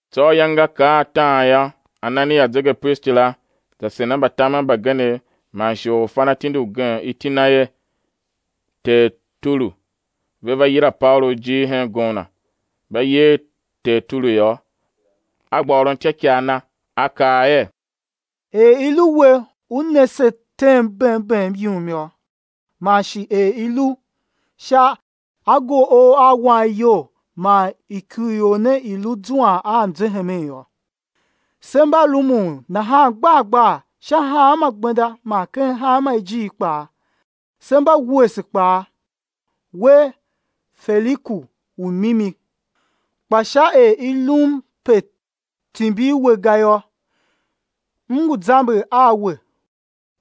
Tsô ayange nga kar ataan yô, Anania, zegepristi la, za sen a mbatamen mbagenev man shi orfanatindi ugen, iti na er Tertulu, ve va yila Paulu ijir hen gomna. Mba yer Tertulu yô, a gba ôron ityôikaa na a kaa er: Er i lu we u ne se tem bem bem yum yô, man shi er i lu sha ago ou a wan iyol man ikurior ne i lu zuan a mzehemen yô, se mba rumun nahan gbar gbar sha hanma gbenda man ken hanma ijiir kpaa, se mba wuese kpaa, we Feliku u mimi. Kpa sha er i lum pe timbir we ga yô, m ngu zamber a we,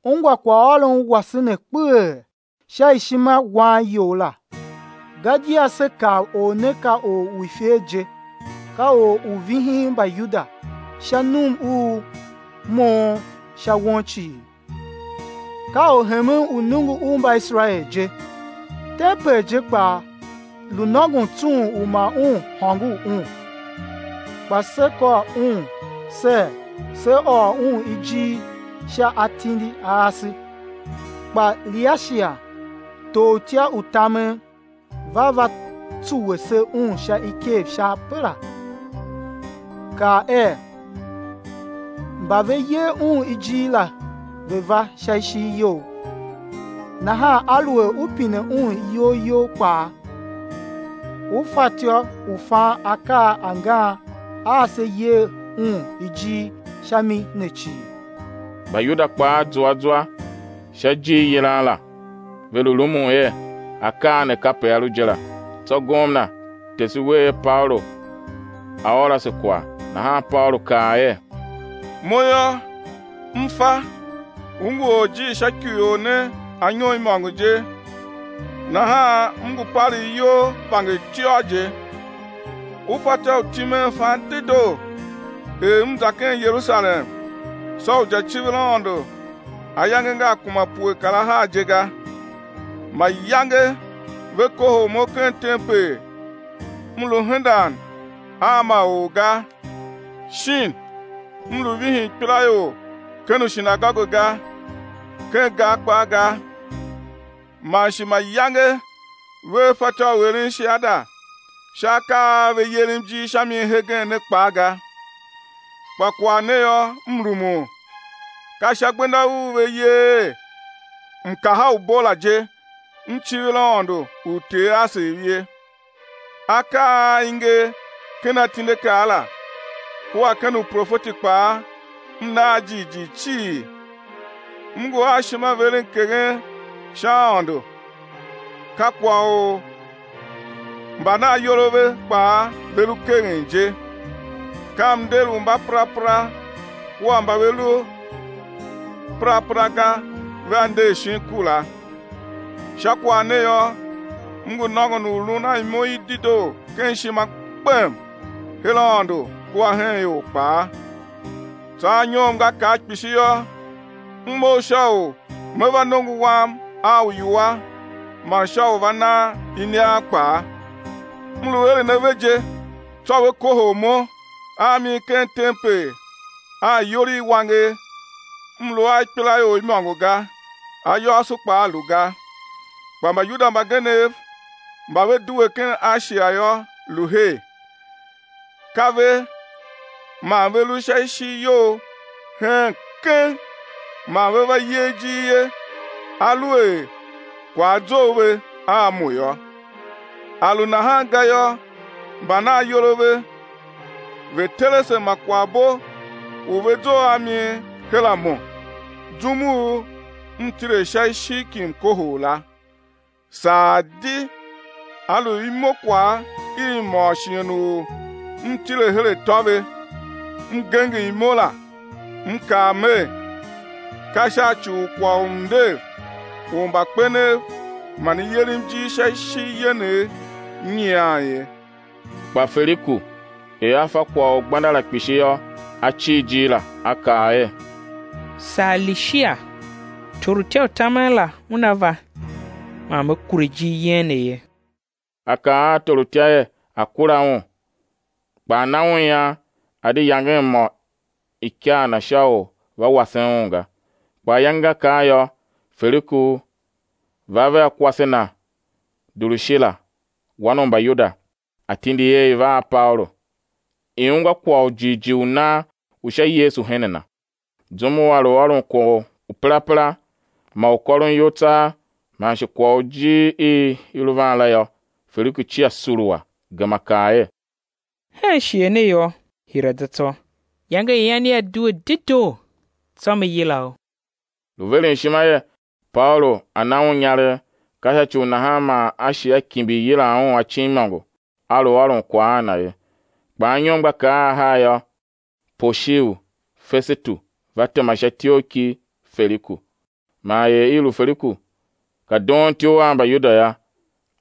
ungwa kwaghôron wase ne kpeghee sha ishimawan you la. Gadia se kav or ne ka or u ifer je, ka or u vihin Mbayuda sha num u moughon sha won cii, ka orhemen u nongo u Mbanasari je. Tempel je kpaa lu nôngon tsung u ma un hôngor un; kpa se kôr un [ser, se ôr un ijir sha atindi a ase. Kpa Lishia, torutya u tamen, va va tsuwe se un sha ikev sha apera; kaa er, mba ve yer un ijir la ve̱ va sha ishigh you.] Nahan aluer u pine un iyol you kpaa, u fatyô u fan akaa angan a se yer un ijir sha mi ne cii. Mbayuda kpaa zua zwa sha ijir yilan la ve lu rumun er, akaa ne kape a lu je la. Tsô gomna tese uwegh er Paulu a̱ ôr ase kwagh, nahan Paulu kaa er: Mo yô, m fa u ngu orjir sha ikurior ne anyom imôngo je, nahan m ngu palegh iyol vangertiôr je. U fatyô u timen fan dedoo er m za ken Yerusalem, sha u za civir Aôndo ayange nga a kuma pue kar ahar je ga. Mayange ve kohol mo ken tempel m lu hendan a ma or ga, shin m lu vihin ikpelaior ken ushinagoge ga, ken gar kpaa ga, man shi mayange vea fatyô u eren shiada sha akaa a ve yerem ijir sha mi hegen ne kpaa ga. Kpa kwagh ne yô, m rumun, ka sha gbenda u ve yer er mkaha u bo la je m civir Aôndo u uter asev ye. Akaa a i nger ken atindiakaa la, kua ken uprofeti kpaa m na a jighjigh cii, m ngu a ishimaverenkeghen sha Aôndo, ka kwagh u mban ayol a ve kpaa ve lu keghen je, ka mnder u mbaperapera kua mba ve lu perapera ga vea nder shin ku la. Sha kwagh ne yô, m ngu nôngon u lun a imo i dedoo ken ishima gbem her Aôndo kua hen ior kpaa. Tsô anyom nga kar kpishi yô, m mough sha u me va nongo wam a uiwua man sha u va nan iniav kpaa. M lu eren ave je, tsô ve kohol mo a mi ken tempel a iyol i wanger, m lu a ikpelaior imôngo ga, ayôôso kpaa lu ga. Kpa Mbayuda mbagenev mba ve due ken Ashia yô, lu her: ka ve ma ve lu sha ishigh you heen keng, ma ve va yer ijir ye, aluer kwagh a zough ve a mo yô. A lu nahan ga yô, mban ayol a ve, ve̱ ter ase ma kwaghbo u ve zough a mi her a mo zum u m tile sha ishigh ki mkohol la, saa di a lu imokwagh i m ôr shighe u m tile her atô ve, m genger imo la, m kaa mer: Ka sha ci u kwagh u mnder u mbakpenev man i yerem ijir sha ishigh yenegh nyian ye. Kpa Feliku, er a fa kwagh u gbenda la kpishi yô, a cir ijir la, a kaa er: Saa Lishia, torutya u tamen la una va, man me kure ijir yen ne ye. A kaa a torutya er a̱ kura un, kpa a̱ na un ian, a̱ de yangen mô ikar na sha u va wasen un ga. Kpa ayange nga kar yô, Feliku va vea kwase na Durushila, wan u Mbayuda; a tindi er i̱ va a Paulu, i̱ ungwa kwagh u jighjigh u nan u sha Yesu hen a na. Zum u a lu ôron kwagh u perapera, man u kôron iyol tsaha man shi kwagh u ijir i i lu van la yô, Feliku cia sulugha, gema kaa er: Hen shighe ne yô, hira za tsô; iyange i ian ia due dedoo, tsô me yila u; lu veren ishima er Paulu a̱ na un inyaregh; ka sha ci u nahan man a shi a kimbir yilan un acin imôngo, a lu ôron kwagh a na ye. Kpa anyom nga kar ahar yô, Porshiu Fesetu va tema sha ityough ki Feliku; man er i lu Feliku ka doon ityough a Mbayuda yô,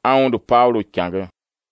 a undu Paulu uikangen.